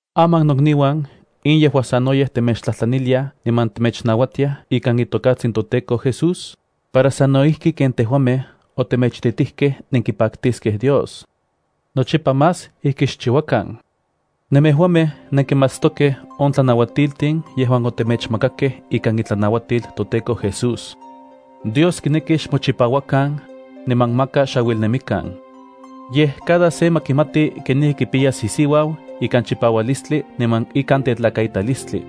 Aman nokniuan, in yejua sanoyej temechtlajtlaniliaj niman temechnauatiaj ikan itokatsin toTEKO Jesús, para sano ijki ken tejuamej otemechititijkej nenkipaktiskej Dios. Nochipa más ijki xchiuakan. Nemejuamej nenkimatstokej on tlanauatiltin yejuan otemechmakakej ikan itlanauatil toTEKO Jesús. Dios kineki xmochipauakan, niman maka xauilnemikan. Yej cada se ma kimati kenijki kipiyas isiuau ikan chipaualistli niman ikan tetlakaitalistli.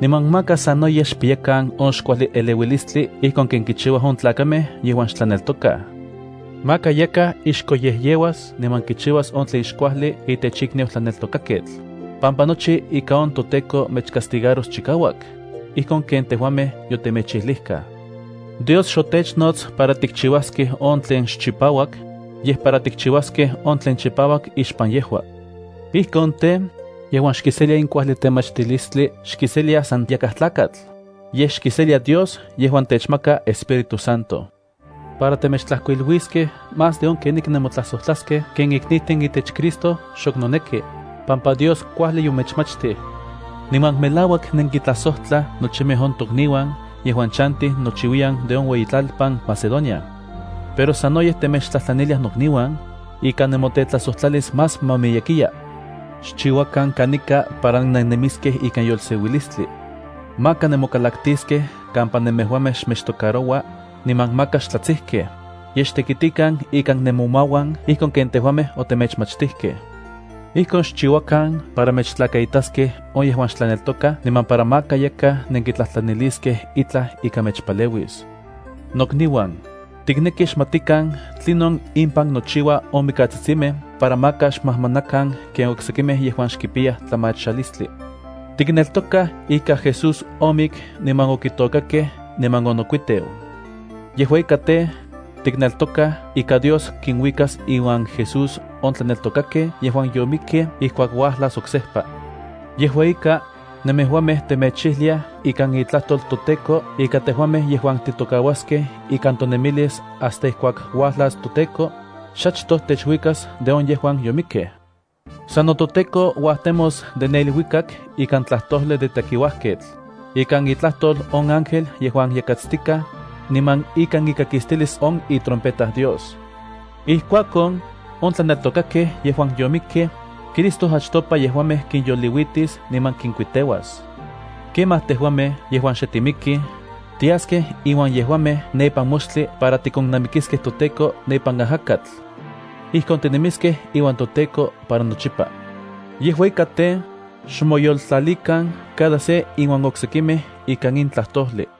Niman maka sanoyej xpiyakan on xkuajli eleuilistli ijkon ken kichiuaj on tlakamej yejuan xhebreos. Maka yakaj ixkoyejyeuas niman kichiuas on tlen xkuajli itech ikniu tlaneltokaketl, pampa nochi ika on toTEKO mechcastigaros chikauak, ijkon ken tejuamej yotemechijlijkaj. Dios xotechnots para tikchiuaskej on tlen xchipauak, yej para tikchiuaskej on tlen chipauak ixpan yejua. Ijkon tej, yejuan xkiselia in kuajli temachtilistli xkiselia san yakaj tlakatl, yej xkiselia Dios yejuan techmaka Espíritu Santo. Para temechtlajkuiluiskej más de on kenijki nemotlajsojtlaskej ken iknijtin itech Cristo xok noneki, pampa Dios kuajli yomechmachtij. Niman melauak nenkintlajsojtlaj nochimej on tokniuan yejuan chantij nochiuiyan de on ueyitlalpan Macedonia. Pero sanoyej temechtlajtlaniliaj nokniuan, ika nemotetlajsojtlalis más ma miyekiya. Xchiuakan kanika para nennemiskej ikan yolseuilistli. Maka nemokalaktiskej kampa nemejuamej xmechtocaroua, niman maka xtlatsijkej, yej xtekitikan ikan nemomauan ijkon ken tejuamej otemechmachtijkej. Ijkon xchiuakan para mechtlakaitaskej on yejuan xtlaneltokaj niman para maka yakaj nenkitlajtlaniliskej itlaj ika mechpaleuis. Nokniuan, tiknekij xmatikan tlinon impan nochiua on mikatsitsimej para maka xmajmanakan ken oksekimej yejuan xkipiyaj tlamachalistli. Tikneltokaj ika Jesús omik niman onokuiteu ipan itlalkon. Yejua ika tej, tikneltokaj ika Dios kinuikas iuan Jesús on tlaneltokakej yejuan yomikkej ijkuak uajlas oksejpa. Yejua ika, nemejuamej temechijliaj ikan itlajtol toTEKO ika tejuamej yejuan titokauaskej ikan tonemilis hasta ijkuak uajlas toTEKO, xachtoj techuikas de on yejuan yomikkej. Sano toTEKO uajtemos de ne iluikak ikan tlajtojli de tekiuajketl, ikan itlajtol on ángel yejuan yakatstikaj, niman ikan ikakistilis itrompeta Dios. Ijkuakon, on tlaneltokakej yejuan yomikkej, Cristo achtopa yejuamej kinyoliuitis niman kinkuiteas. Kemaj tejuamej yejuan xe timikij, tiaskej inuan yejuamej ne ipan moxtli para tikonnamikiskej toTEKO ne ipan ajakatl. Ijkon tinemiskej iuan toTEKO para nochipa. Yejua ika tej, xmoyoltlalikan cada se inuan oksekimej ika in tlajtojli.